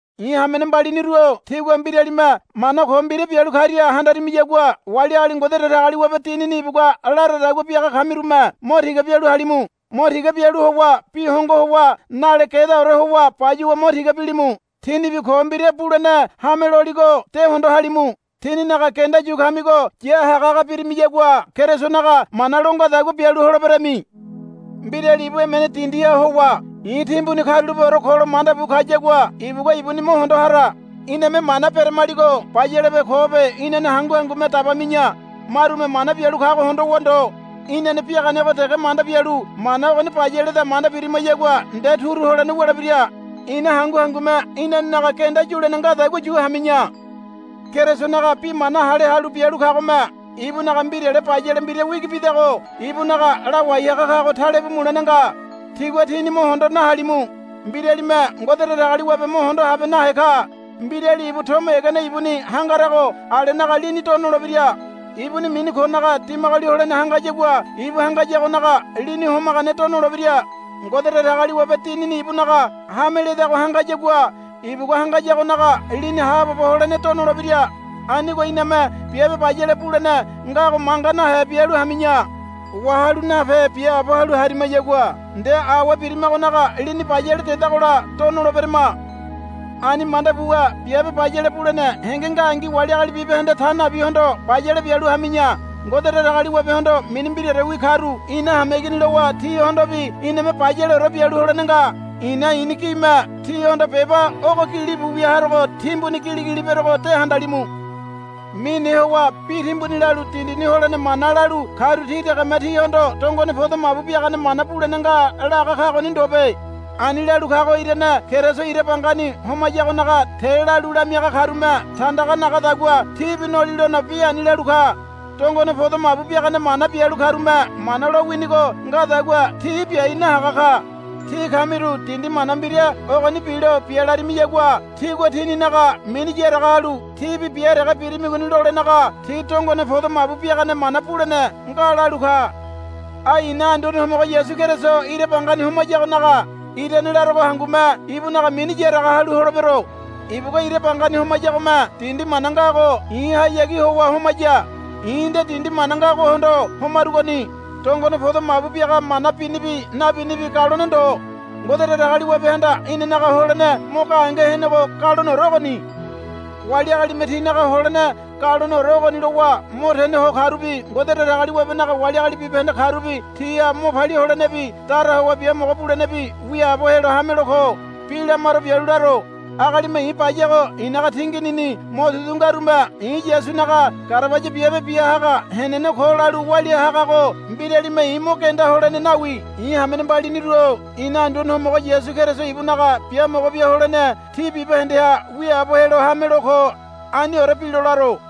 I̱ hamene mbaliniru-o tígua mbiralime mana ko mbira bialu karia handarimiyagua wali agali Ngode Datagaliwabe Dinini ibugua laradagua biaga kamirume mo tiga bialu halimu. Mo tiga bialu howa bi hongo howa nale gedaore howa bayuwa mo tiga bilimu. Tínibi ko mbira bulene hame loligo de hondo halimu. Tíninaga genda yu kamigo ya hagahaga birimiyagua Kerisonaga mana lo ngadagua bialu holeberami. Mbirali ibu emene dindiha howa, I̱ timbuni karulapeore ko, lo manda bu kayagua ibugua ibuni mo hondo hara. Iname mana beramaligo bayalebe kobe inane hangu hangume dabami̱ya. Marume mana bialu kago hondowa ndo. Inane biaganego dege manda bialu, Mana ogoni bayaleda, manda biramayagua nde turu holene wulebira. Ina hangu hangume inanenaga genda yulene ngadagua yu hami̱ya. Kerisonaga bi mana hale halu bialu kagome ibunaga mbirale bayale mbira wigi bidago ibunaga lawai haga kago talebu mulene nga. Tígua tíni mo hondo nahalimu. Mbiralime Ngode Datagaliwabe mo hondo habe nahe ka. Mbirali ibu tomo egene ibuni hangarago alenaga lini do nolebira. Ibuni mini konaga dimagoli holene hangayagua ibu hangayagonaga lini homagane do nolebira. Ngode Datagaliwabe Dinini ibunaga hame ledago hangayagua ibugua hangayagonaga lini haabobo holene do nolebira. Anigo iname biabe bayale bulene ngago manga nahe bialu hami̱ya. Wahalu nape biaabo halu harimayagua nde awe birimagonaga lini bayale dedagola do noleberama. Ani manda buwa biabe bayale bulene henge ngangi wali agali bibahende ta nabihondo bayale bialu hami̱ya. Ngode Datagaliwabehondo mini mbiraorewi karu ina hameigini lowa tihondobi iname bayaleore bialu holene nga. I̱na i̱ni gime tíhondo beba ogo gilibu wia harogo timbuni giligili berogo de handalimu. Mine howa bi timbuni lalu dindini holene mana lalu karu ti degeme tíhondo dongone podo mabu biagane mana bulene nga laga kagoni ndobe. Ani lalu kago irane Keriso ira bangani homayagonaga te lalu lamiaga karume tandaga nagadagua tibi nolilono bi ani lalu ka. Dongone podo mabu biagane mana bialu karume Mana lo winigo ngadagua ti biai nahaga ka. Tí kamiru dindi mana mbira ogoni bilo bia larimiyagua tigua tininaga mini yaraga halu, Tíbi bia dege birimigoni, lolenaga, Tí dongone podo mabu biagane mana bulene nga, lalu ka. Ai i̱na Anduane Homogo Yasu Keriso ira bangani homayagonaga irane larogo hangume ibunaga mini yaraga halu holebero. Ibugua ira bangani homayagome dindi mana ngago i̱hayagi howa homaya. I̱ nde dindi mana ngagohondo homarugoni. Dongone podo mabu biaga mana binibi nabinibi galone ndo. Ngode Datagaliwabehanda inanaga holene mo gahenge henego galoneore ogoni. Wali agalime tinaga holene galoneore ogoni lowa mo tene ho karubi Ngode Datagaliwabenaga wali agali bibahende karubi tiha mo palia holenebi dara howa biamogo bulenebi wiaabo helo hamelo ko. Bi lamaro bialu laro. Agalime i̱ bayago i̱naga tinginini motudu ngarume i̱ Yasunaga garabaya biabe bia haga henene ko lalu walia hagago mbiralime i̱ mo genda holene nawi. I̱ hamene mbaliniru-o ina Anduane Homogo Yasu Keriso ibunaga biamogo bia holene tí bibahendeha wiaabo helo hamelo ko. Aniore bilo laro.